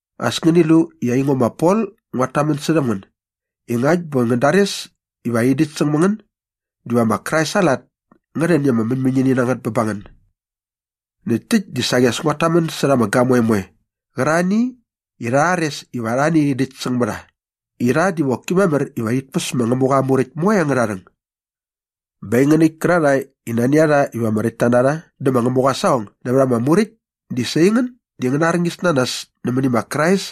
As ngäni lu i aingo ma Pol nguat tamän särhäm ngän i ngakt bä ngän dares iva rhi däkt säng mä ngän diva ma Krais aa lat ngä rhän i ama mäñmäñini na ngät bä ba ngän. Näkt täkt dä saqi as nguat tamän särha ama gamoe moe qärarhani i rha rhares iva arhani rhi däkt säng mä rha i rha diva qoki mamär iva rhit päs ma Ngämuqa aa Muräkt moe angärha rhäng. Bä aingän äkt kärarhae i nani a rha iva ama räktta na rha dä ma Ngämuqa aa saqong nävät ama Muräkt di sa aingän di ngäna arñis na nas nämäni ma Krais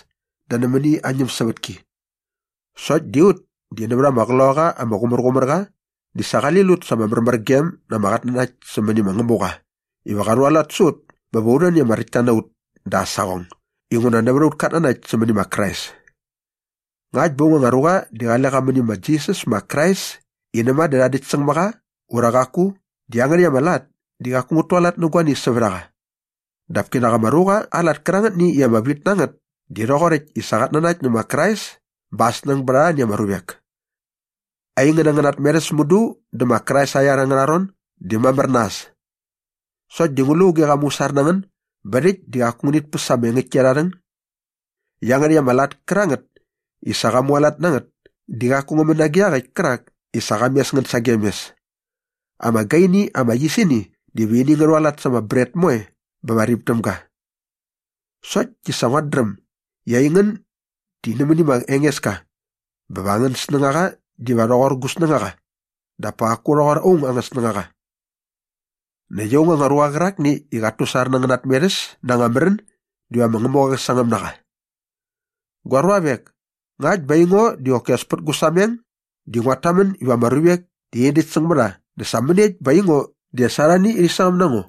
dä nämäni aa ñämsävätki. Sokt di ut di nävät ama Qloqaqa ama Qumärqumärqa di sa qali lut sa ama märmärgem na ama qatnanakt sämäni ma Ngämuqa iva qa rhualat sä ut bä va u rhän i ama räktta na ut da aa saqong inguna nävät aut katnanakt sämäni ma Krais. Ngakt bä aung anga ruqa di qale qa mäni ma Jisas ma Krais i näma dä rha däkt säng mä qa ura qaku di iangärhäkt ama lat di qaku ngät tualat nä guani sävät a qa. Dap kinak ama ruqa aa lat kärangätni i ama vit na ngät di rhoqoräkt i sa qat nanakt nä ma Krais bä aa snäng bät arhani ama ruvek. Aingän angäna tmerhäs mudu dä ma Krais aa iar angärha ron di mamär na äs. Sokt di ngu lu auge qa musar na ngän bä rhäkt di qaku ngänit päs ama engäktki arha rhäng? Iangärhäkt ama lat kärangät i sa qa mualat na ngät di qaku ngä män nage iaqäkt kärak i sa qa mes ngän sagem mes. Ama gaini ama yisini diva ini ngä rhualat sa ama bret moe bä va rip däm ga. Sokt di sa nguat dräm i aingän di nämäni ma Engeska bä va angän snängaqa diva rhoqor ngo gu snängaqa dap pa qaku qa rhoqor aung aa anga snängaqa. Näkt aung anga ruqa qärakni i qat tusar na angäna tmerhäs na anga märän diva ma Ngämuqa qä sangäm na qa. Gua ruavek, ngakt bä aingo di qoki as pät gu sameng di nguat tamän iva ama ruvek di rhi nädäkt säng mä rha dä sa mäniekt bä aingo di as arhani rhi sangäm na ngo?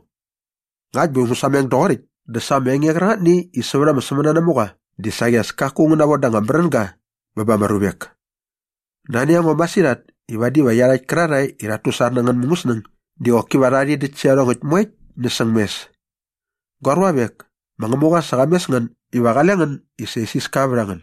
Ngakt bä ngu sameng doqoräkt dä sa ama enge qärangätni i sävät ama sämänanamuqa di saqi as kaku ngä navoda anga märänga bä ba ama ruvek. Nani a ngo masirhat i vadi va iarhakt kärarhae i rhat tusar na angän mungäsnäng di qoki va rha rhi däkt sä iarhongäkt moekt näsäng mes. Gua ruavek, ma Ngämuqa sa qa mes ngän iva qale ngän i sa isiska vät a ngän.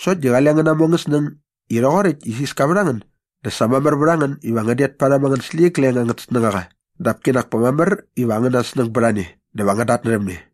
Sokt di qale ngän namu angän snäng i rhoqoräkt i isiska vät a ngän dä sa mamär vät a ngän iva ngän det parhäm angän släqyigleng angät snängaqa dap kinak pa mamär iva angäna snäng bät a ne dä va ngän datnärhäm ne.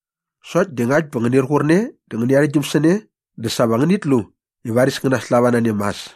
Sokt di ngakt bä ngänir qur ne dä ngäni arhäktgyäm sä ne dä sa va ngänit lu i varis ngän naslava na ne mas.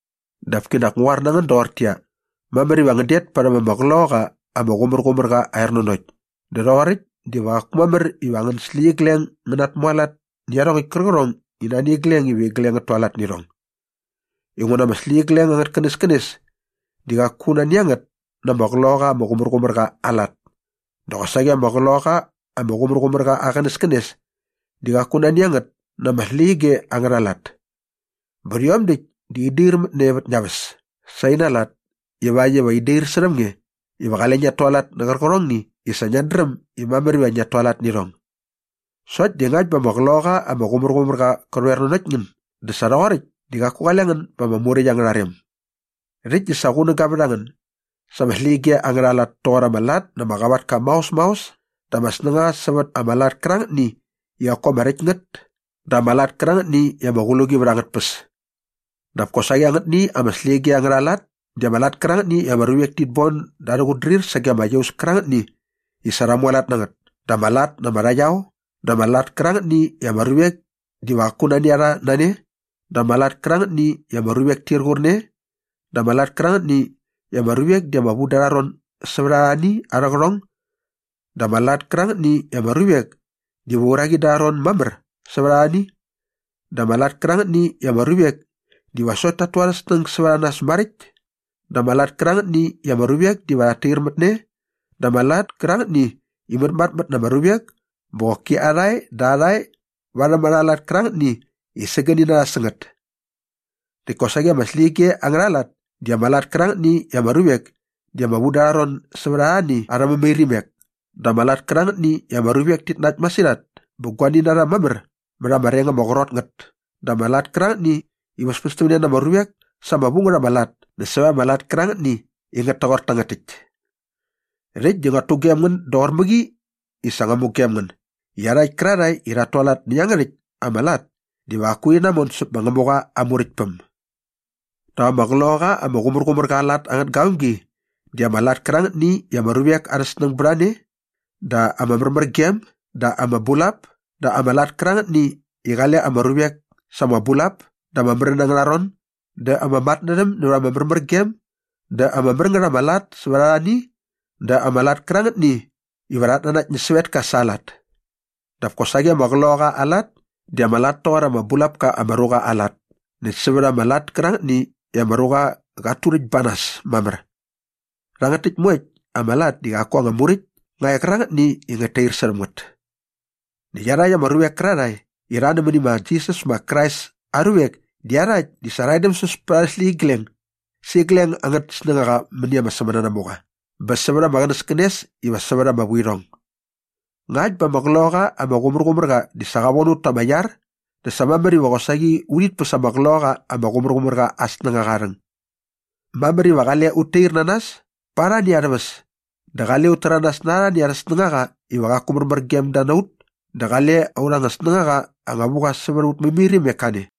Dap kinak ngu qoar na ngän doqortäqyia, mamär iva ngän det parhäm ama Qloqaqa ama Qumärqumärqa aa ernanokt dä rhoqoräkt diva qaku mamär iva angän släqyigleng ngä natmualat nä iarhongäkt kärqärhong i nani igleng iva igleng ngät tualat nä irhong. Inguna ama släqyige angät känäskänes di qaku nani a ngät na ama Qloqaqa ama Qumärqumärqa aa lat dä qosaqi ama Qloqaqa ama Qumärqumärqa aa qänäskänes di qaku nani a ngät na ama släqyige angärha lat. Bä rhiom däkt di in dair mät ne vät ngia väs sä ina lat ivakt iva in dair särhäm nge iva qale ngiat tualat nä qärqärhongni i sa ngiat dräm i mamär iva ngiat tualat nä irhong. Sokt di ngakt bä ama Qloqaqa ama Qumärqumärqa qä rhoer nanokt ngän dä sa rhoqoräkt di qaku qale ngän ba ama Muräkt angärha rem. Rhäkt di sa qunäga vät a ngän sa ama släqyige angärha lat toqor ama lat na ama qavatka maos maos dä ama snängaqa sävät ama lat kärangätni i qaku ama räkt ngät dä ama lat kärangätni i ama qluqi vät angät tpäs. Dap kosaqi angätni ama släqyige angärha lat di ama lat kärangätni i ama ruvek tit bon da arhä qutdrir sage ama iaus kärangätni i sa rha mualat na ngät dä ama lat na ama rhaqyao dä ama lat kärangätni i ama ruvek diva qaku nani a rha na ne dä ama lat kärangätni i ama ruvek tir qur ne dä ama lat kärangätni i ama ruvek di ama vu da arha ron sävät arhani arhä qärhong dä ama lat kärangätni i ama ruvek diva uraqi da arha ron mamär sävät arhani dä ama lat kärangätni i ama ruvek diva sokt tat tu arhä snäng sävät a nas maräkt dä ama lat kärangätni i ama ruvek diva rhat tair mät ne dä ama lat kärangätni i mätmatmät na ama ruvek bä qoki arhae dä arhae varhäm arha lat kärangätni i sägäni na rha sä ngät. Näkt kosaqi ama släqyige angärha lat di ama lat kärangätni i ama ruvek di ama vu da arha ron sävät arhani arhä mämairimek dä ama lat kärangätni i ama ruvek tit nakt masirhat bä guani na rha mamär mät ama reng ama qrot ngät dä ama lat kärangätni i väspästämne na ama ruvek sa ama vu ngät ama lat näkt sävät ama lat kärangätni i ngät toqor tangät täkt. Rhäkt di nguat tugem ngän doqor mäqi i sa ngua mugem ngän i iarhakt kärarhae i rhat tualat nä iangärhäkt ama lat diva qaku rhi namon säp ma Ngämuqa aa Muräktpäm. Dap ama Qloqaqa ama Qumärqumärqa aa lat angät gavämgi di ama lat kärangätni i ama ruvek arha snäng bät a ne dä ama märmärgem dä ama bulap dä ama lat kärangätni i qale ama ruvek sa ama bulap da ama märän angärha ron dä ama matnärhäm nävät ama märmärgem dä ama mär ngät ama lat sävät arhani dä ama lat kärangätni iva rhat nanakt nä sävetka sa aa lat. Dap kosaqi ama Qloqaqa aa lat di ama lat toqor ama bulap ka ama ruqa aa lat näkt sävät ama lat kärangätni i ama ruqa qat turäkt ba nas mamär. Rhangät täkt moekt ama lat di qaku anga muräkt nga e qärangätni i ngät tair särhäm ngät. Näkt iarhakt ama ruvek kärarhae i rha nämäni ma Jisas ma Krais aa ruvek di iarhakt di sa rha edämsäs pät arhä släqyigleng sä igleng angät snängaqa mäni ama sämänanamuqa bä sävät ama qänäskänes iva sävät ama vuirhong. Ngakt bä ama Qloqaqa ama Qumärqumärqa di sa qa von ut ta ama iar dä sa mamär iva qosaqi urhit päs ama Qloqaqa ama Qumärqumärqa aa snängaqa aa rhäng. Mamär iva qale ut tair na nas pa arhani arhä väs dä qale ut täranas na arhani arhä snängaqa iva qaku märmär gem da na ut dä qale aurha anga snängaqa anga vu qa sävät aut mämairimek kane.